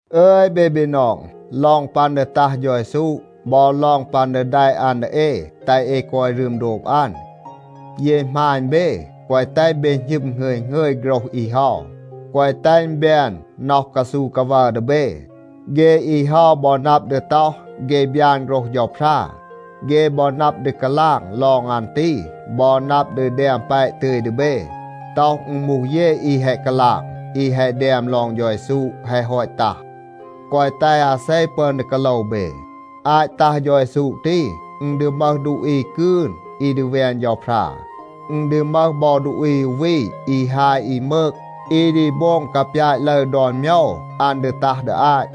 อึย เบ บีนอง, ลอง ปัน ดี ตัห เฌา เยซู บอ ลอง ปัน ดี แดะ อัน ดี เอ แตห เอ กอย รึม โดบ อัน, เย หมาณ เบ, แกวะ แตห เบ หณึม หงึย หงึย โฆรห อี เฮา. แกวะ แตห อึณ แบน น็อห กาซู กาวัร ดี เบ. เฆ อี เฮา บอ นับ ดี ต็อห, เฆ บยาน โฆรห เฌาพรา. เฆ บอ นับ ดี กาลาง ลอง อัน ตี บอ นับ ดี แดม แปะ ตึย ดี เบ, ต็อห อึณ มูห เย อี แฮะ กาลาง, อี แฮะ แดม ลอง เฌา เยซู แฮะ ฮอต ตัห. แกวะ แตห อาเซ ปึอน ดี กาโลว เบ. อาต ตัห เฌา เยซู ตี, อึณ ดี มึห ดูอี กืน อี ดี แวน เฌาพรา. อึณ ดี มึห บอ ดูอี อู วี อี ฮาย อี มืก, อี ดี โบง กาปยาต ลึร ดอน โมยว อัน ดี ตัห ดี อาต.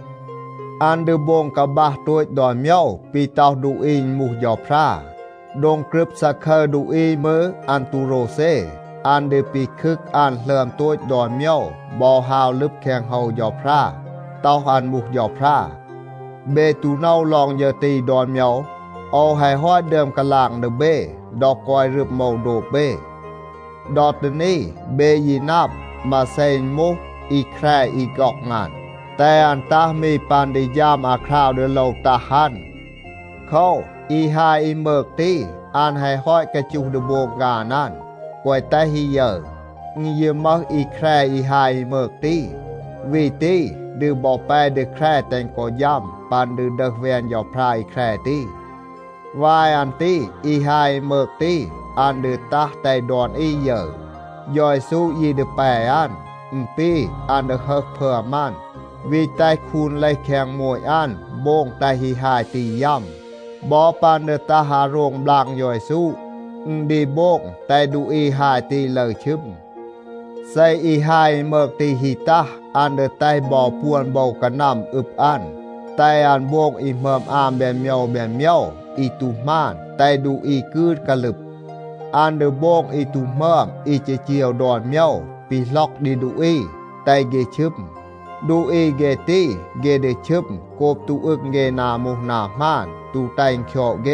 อัน ดี โบง กาบัห โตต ดอน โมยว ปี ต็อห ดูอี อึณ มูห เฌาพรา. โดง กรึบ ซาคึร ดูอี มืร อัน ตู โรวเซ. อัน ดี ปีคึก อัน หลึอม โตต ดอน โมยว บอ ฮาว ลึบ แคง โฮว เฌาพรา, ต็อห อัน มูห เฌาพรา. เบ ตู โนว ลอง ฌึร ตี ดอน โมยว? โอว แฮะ ฮอต ดึอม กาลาง ดี เบ ดอ กอย รึม โอว โดบ เบ. ดอ ตี นี เบ ยี นับ, มาเซ อึณ มูห อี แคร อี ฆ็อง อัน, แตห อัน ตัห มี ปัน ดี ฌัม อาคราว ดี โลว ตัห อัน. โคว, อี ฮาย อี มืก ตี, อัน แฮะ ฮอต กาจูห ดี โบง ฆาน อัน, แกวะ แตห อี ยึร. อึณ ยี มึห อี แคร อี ฮาย อี มืก ตี. วี ตี ดี บอ แป ดี แคร แตห กอ ฌัม ปัน ดี ดึห แวน เฌาพรา อี แคร ตี. วาย อัน ตี อี ฮาย อี มืก ตี, อัน ดี ตัห แตห ดอน อี ยึร. เฌา เยซู ยี ดี แป อัน. อึณ ปี อัน ดี ฮึห พึอม อัน, วี แตห คูน เลห แคง โมต อัน โบง แตห อี ฮาย ตี ยัม. บอ ปัน ดี ตัห อาโรง บลาง เฌา เยซู, อึณ ดี โบง แตห ดูอี ฮาย ตี ลึร ชึม. เซ อี ฮาย อี มืก ตี ฮี ตัห, อัน ดี แตห บอ ปวน โบว กานัม อึบ อัน, แตห อัน โบง อี หมึอม อาม แบน โมยว แบน โมยว อี ตู หมาน, แตห ดูอี กืน กาลึบ. อัน ดี โบง อี ตู หมึอม อี จีจีว ดอน โมยว, ปีหล็อก ดี ดูอี, แตห เฆ ชึม. ดูอี เฆ ตี, เฆ ดี ชึม โกบ ตู อึง เฆ นา มูห นา หมาน, ตู แตห อึณ คยอด เฆ.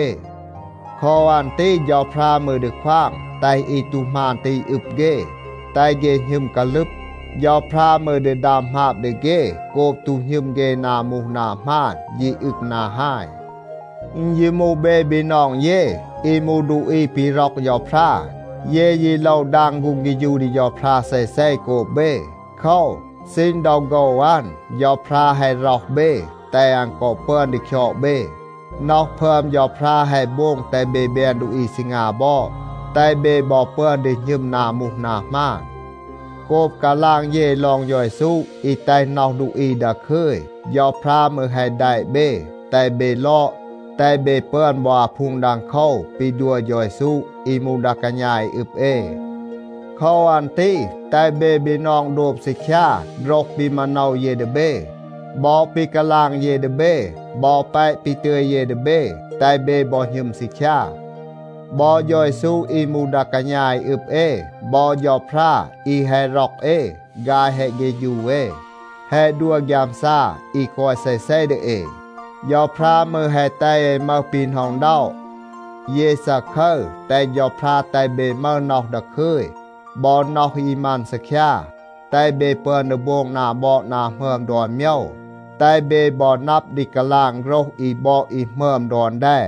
โคว อัน ตี เฌาพรา มืร ดี ควาง แตห อี ตู หมาน ตี อึบ เฆ, แตห เฆ หณึม กาลึบ. เฌาพรา มืร ดี ดัม หมาบ ดี เฆ โกบ ตู หณึม เฆ นา มูห นา หมาน, ยี อึง นา ฮาย. อึณ ยี มูห เบ บีนอง เย, อี มูห ดูอี ปี ร็อก เฌาพรา, เย ยี โลว ดาง ฆูง เฆฌู ดี เฌาพรา เซเซ โกบ เบ. โคว, ซีณ ดอ โฆว อัน, เฌาพรา แฮะ ร็อห เบ แตห อัน กอ ปึอน ดี คยอด เบ. น็อห พึอม เฌาพรา แฮะ โบง แตห เบ แบน ดูอี ซีงา บอด, แตห เบ บอ ปึอน ดี หณึม นา มูห นา หมาน. โกบ กาลาง เย ลอง เฌา เยซู อี แตห น็อห ดูอี ดาคึย, เฌาพรา มืร แฮะ แดะ เบ, แตห เบ ลอด, แตห เบ ปึอน บอ อาพูง ดังโคว ปี ดัว เฌา เยซู อี มูห ดา กาณา อี อึบ เอ. โคว อัน ตี แตห เบ บีนอง โดบ ซีคยา โฆรห ปี มาโนว เย ดี เบ. บอ ปี กาลาง เย ดี เบ, บอ แปะ ปี ตึย เย ดี เบ, แตห เบ บอ หณึม ซีคยา. บอ เฌา เยซู อี มูห ดา กาณา อี อึบ เอ บอ เฌาพรา อี แฮะ ร็อก เอ, ฆาย แฮะ เฆฌู เอ, แฮะ ดัว ฆยามซา อี กอย เซเซ ดี เอ. เฌาพรา มืร แฮะ แตห เอ มึห ปี หน็อะ อึณด็อะ. เย ซาคึร, แตห เฌาพรา แตห เบ มึห น็อห ดาคึย บอ น็อห อี มัน ซีคยา, แตห เบ ปึอน ดี โบง นา บอด นา หมึอม ดอน โมยว, แตห เบ บอ นับ ดี กาลาง โฆรห อี บอด อี หมึอม ดอน แด.